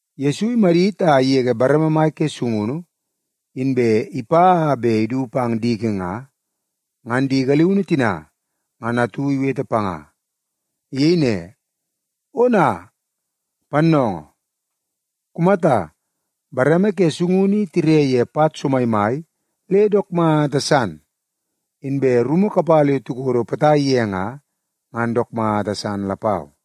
Yesu imadit a igege bareme mai ke sungunu, inbe ipa a bet idu pang diki nga, ngan di galiunu tina ngan atu iwete panga. Iyei ne, “Ona, Pannoongoo! Kumata, bareme ke sungunu i tire ye pat somaimai le dook mata san! Inbe rumu kapala yo tikodo potai ye nga, ngan dook mata san lapau.”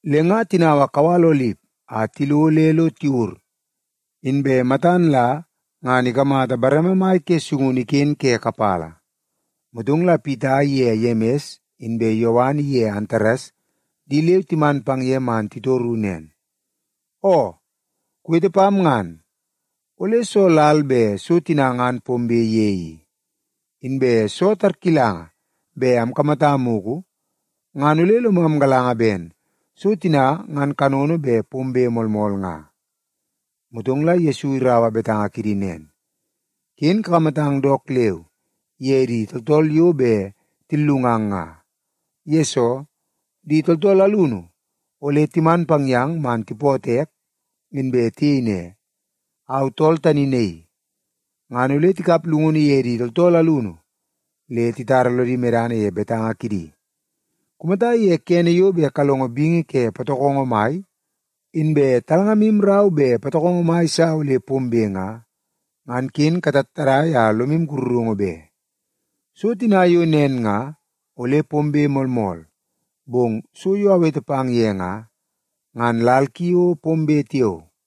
Le nga tinaua kawal Olip a tilo le lo iwur, inbe matan la ngan ikamata bareme mai ke sungunu iken ke kapala. Motong la Pita iye Yemis inbe Yowan iye Antares di leu timan pang ye man titoru nen, “Oo, kuwete pam ngan, ole soo lal bet so tina ngan pombe ye i? Inbe soo tarkilanga bet amkamata mugu, ngan ole lomam galanga ben so tina ngan kanono bet pombe moolmool nga?” Motong la Yesu iraua betanga kidi nen, “Ken kakamatang dook leu ye di tooltool yo bet tillungang nga. Yesoo, di tooltool alunu ole timan pang yang man tipootoo ek inbe tiyei ne, ‘Au tool tani naii.’ Ngan ole tikap llungunu ye di tooltool alunu le titara lodi medana ye betanga kidi. Kumata ye kene yo bet kalongo bingi ke patokongo mai, inbe talngamu rau bet patokongo mai sa ole pombe nga, ngan ken katattadai a lomu sakarungu be. So tina yo nen nga ole pombe moolmool, bong so yo awete pang ye nga, ngan lal ki o pombe tiao.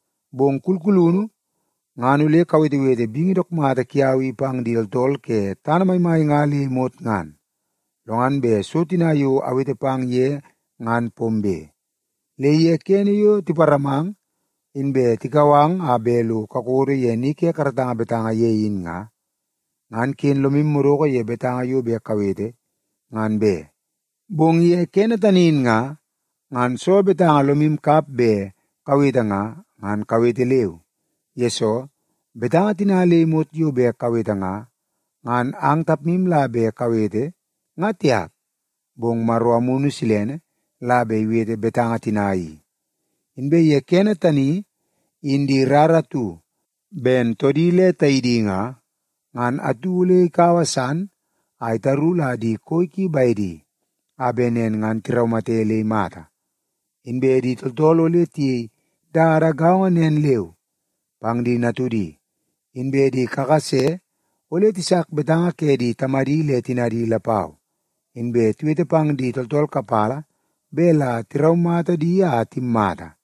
Bong kulkulunu ngan ole kawetewete bingi dook mata kiau i pang di tooltool ke tana maimai nga le imot ngan, lo ngan bet so tina yo awete pang ye ngan pombe. Le ye kene yo tiparamang inbe tikau ang a bet lo kakodo ye ni ke karatanga betanga ye in nga, ngan ken lomu madoko ye betanga yo bet kawete, ngan be. Bong ye kene tani in nga, ngan soo betanga lomu kap bet kawete nga, ngan kawete leu. Yesoo, betanga tina le imot yo bet kawete nga, ngan ang tapmu la bet kawete nga tiap, bong Maro Amunu Silene la bet iwete betanga tina i. “Inbe ye kene tani in di rara atu ben toodi le taidi nga, ngan atu ole ikaua san a itaru la di koi ki bedi, a bet nen ngan tiraumate le imata. Inbe di tooltool ole tiyei dada gaongo nen leu pang di natudi. Inbe di kakase ole tisak betanga ke di tamadi le tinadi lapau, inbe tiwete pang di tooltool kapala bet la tiraumata di a timmata.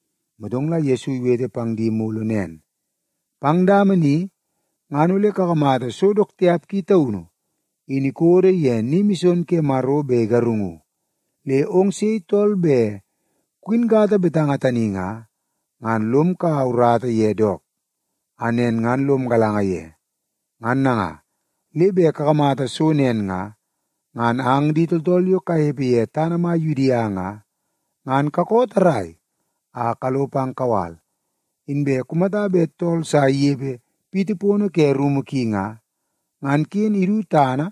Motong la Yesu iwete pang di mulu nen, “Pang dama ni ngan ole kakamata so dook tiap ki taunu in ikodo ye ni mison ke Maro bet igarungu. Le ong sei tooltool bet kukinkata betanga tani nga, ngan lom kaua urata ye dook, a nen ngan lom galanga ye. Ngan nanga, le bet kakamata so nen nga, ngan ang di tooltool yo kanepe ye tana mai Yudia nga, ngan kakoo tarrai a kalo pang kawal. Inbe kumata bet tool sa inepe rumu pono ki nga, ngan ken idu tana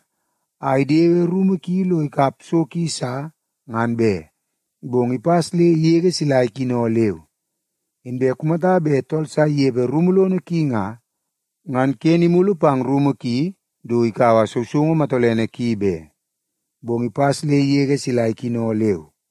a idewe rumu ki lo ikap so ki sa, ngan be, bong ipas le igege sila ikino leu. Inbe kumata bet tool sa inepe kumu lono ki nga, ngan ken imulu pang rumu ki du ikaua sousoungu matolene ki be, bong ipas le igege sila ikino leu.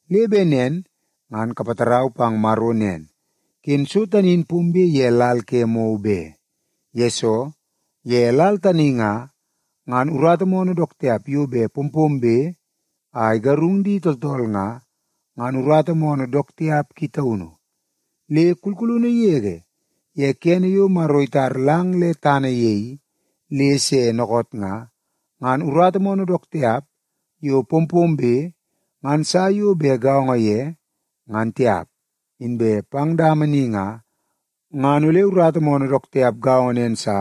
Le bet nen ngan kapatarau pang Maro nen, ken so tani in pombe ye lal ke mou be. Yesoo, ye lal tani nga, ngan urata moonoo dook tiap yo bet pompombe a igarung di tooltool nga, ngan urata moonoo dook tiap ki taunu. Le kulkulunu yege ye kene yo Maro itar lang le tana ye i, le se dookoot nga, ngan urata moonoo dook tiap yo pompombe ngan sa yo bet gaongo ye ngan tiap. Inbe pang dama ni nga, ngan ole urata moonoo dook tiap gaongo nen sa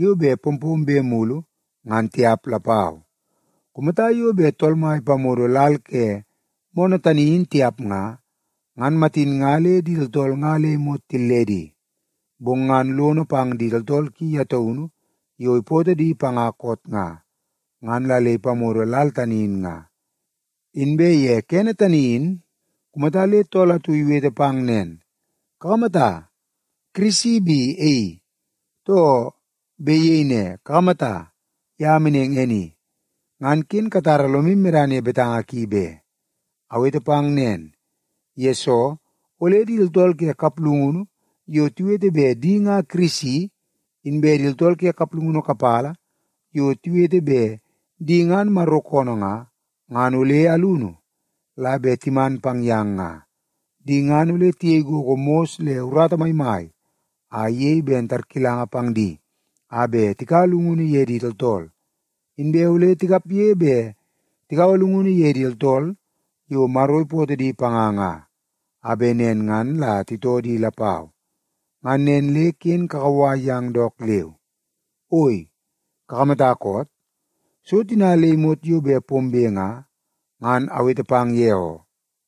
yo bet pompombe mulu, ngan tiap lapau. Kumata yo bet Tool Mai ipamodo lal ke moonoo tani in tiap nga, ngan matin nga le di tooltool nga le imot tilledi. Bong ngan lono pang di tooltool ki ye taunu yo ipootoo di panga koot nga, ngan la le ipamodo lal tani in nga. “Inbe ye kene tani in kumata le tool atu iwete pang nen, ‘Kakamata, Kirisi bi e i!’ too, bet iyei ne, ‘Kakamata, ye meneng e ni!’ ngan ken katara lomu medana ye betanga ki be. Awete pang nen, yesoo ole di tooltool ke kaplungunu yo tiwete bet di nga Kirisi, inbe di tooltool ke kaplungunu kapala yo tiwete bet di ngan Maro koonoo nga, ngan ole alunu la bet timan pang yang nga. Di ngan ole tiyei gogo mos le urata maimai a iyei ben tarkilanga pang di, a bet tikaua llungunu ye di tooltool. Inbe ole tikapge bet tikaua llungunu ye di tooltool yo Maro ipootoo di panga nga, a bet nen ngan la titoo di lapau. Ngan nen le ken kakauwai yang dook leu. Oi, kakamata koot? So tina le imot yo bet pombe nga, ngan awete pang ye oo.”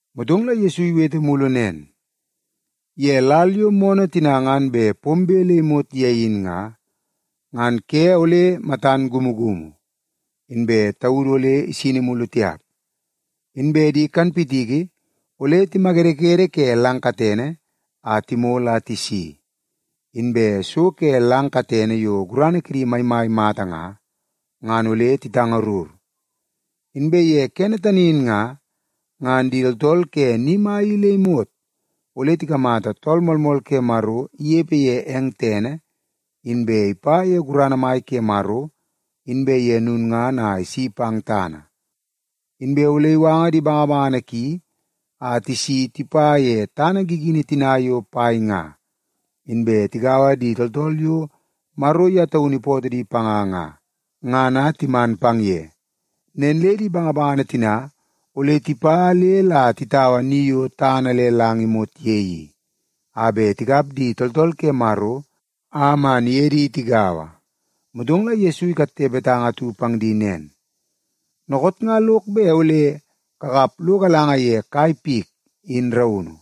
Motong la Yesu iwete mulu nen, “Ye lal yo moonoo tina ngan bet pombe le imot ye in nga, ngan ‘ke ole matan kumukumu, inbe taudu ole isini mulu tiap. Inbe di kanpitiki ole timakedekede ke lang katene a timol a tisi, inbe so ke lang katene yo gurana kidi maimai mata nga, ngan ole titangarur.’ “Inbe ye kene tani in nga, ngan di tooltool ke ni mai i le imot ole tikamata Tool Moolmool ke Maro inepe ye eng tene, inbe ipa ye gurana mai ke Maro inbe ye lulngana a isi pang tana. Inbe ole iwanga di bangabangana ki a si tipa ye tana gigini tina yo pai nga, inbe tigaua di tooltool yo Maro ye taunu ipootoo di panga nga, ngan a timan pang ye. Nen le di bangabangana tina ole tipa le la titaua ni yo tana le lang imot ye i, a bet tikap di tooltool ke Maro a man iye di tigaua.” Motong la Yesu ikatte betanga atu pang di nen, “Dookoot nga lok bet ole kakap lo galanga ye kai pik in raunu.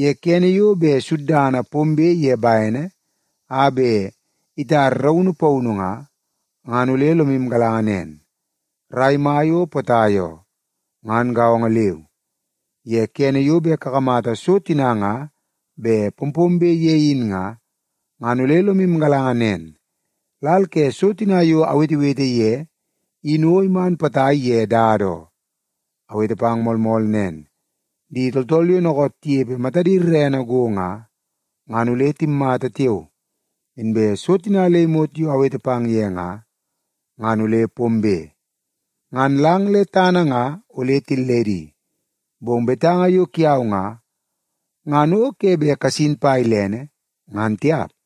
Ye kene yo bet suddana pombe ye bene a bet itar raunu paunu nga, ngan ole lomu galanga nen, rai mai o potai oo. Ngan gaongo leu, ye kene yo bet kakamata so tina nga bet pompombe ye in nga, ngan ole lomu galanga nen, lal ke so tina yo awetewete ye in o iman potai ye dada oo. Awete pang moolmool nen, di tooltool yo dookoot tinepe matadi rerene go nga, ngan ole timmata tiao, inbe so tina le imot yo awete pang ye nga, ngan ole pombe. Ngan lang le tana nga ole tilledi, bong betanga yo kiau nga, ngan o ke bet kasin pa ilene, ngan tiap.”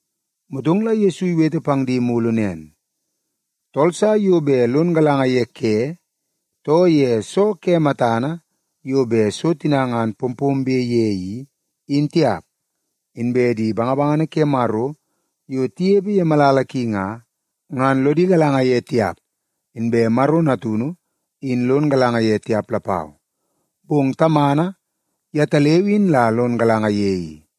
Motong la Yesu iwete pang di mulu nen, “Tool sa yo bet lon galanga ye ke, too ye soo ke matana yo bet so tina ngan pompombe ye i, in tiap. Inbe di bangabangana ke Maro yo tinepe ye malala ki nga, ngan lodi galanga ye tiap, inbe Maro Natunu in lon galanga ye tiap lapau, bong Tamana yetaleu in la lon galanga ye i.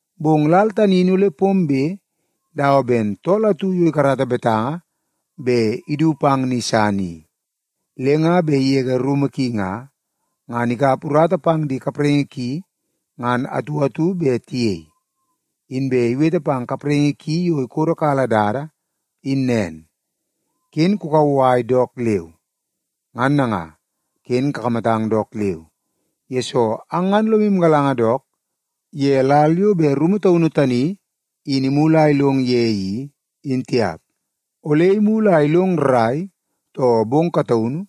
Bong lal tani in ole pombe dawa ben tool atu yo ikarata betanga bet idu pang ni san i. Le nga bet igege rumu ki nga, ngan ikap urata pang di kapraingi ki ngan atu atu bet tiyei. Inbe iwete pang kapraingi ki yo ikodokala dada in nen, ‘Ken kukauwai dook leu.’ “Ngan nanga, ken kakamatang dook leu, yesoo ang ngan lomu galanga dook ye lal yo bet rumu taunu tani in imulu a ilong ye i, in tiap. Ole imulu a ilong rrai, too bong kataunu,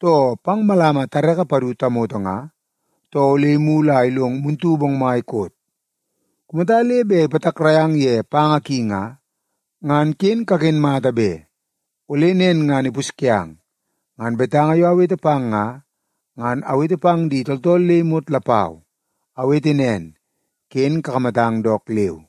too pang malama tareke ipadu tamoto nga, too ole imulu a ilong muntu bongmai koot? Kumata le bet ipatakrai ang ye panga ki nga, ngan ken kaken mata be, ole nen ngan ipusye ang. Ngan betanga yo awete pang nga, ngan awete pang di tooltool le imot lapau. Awete nen, ken kakamatang dook leu!”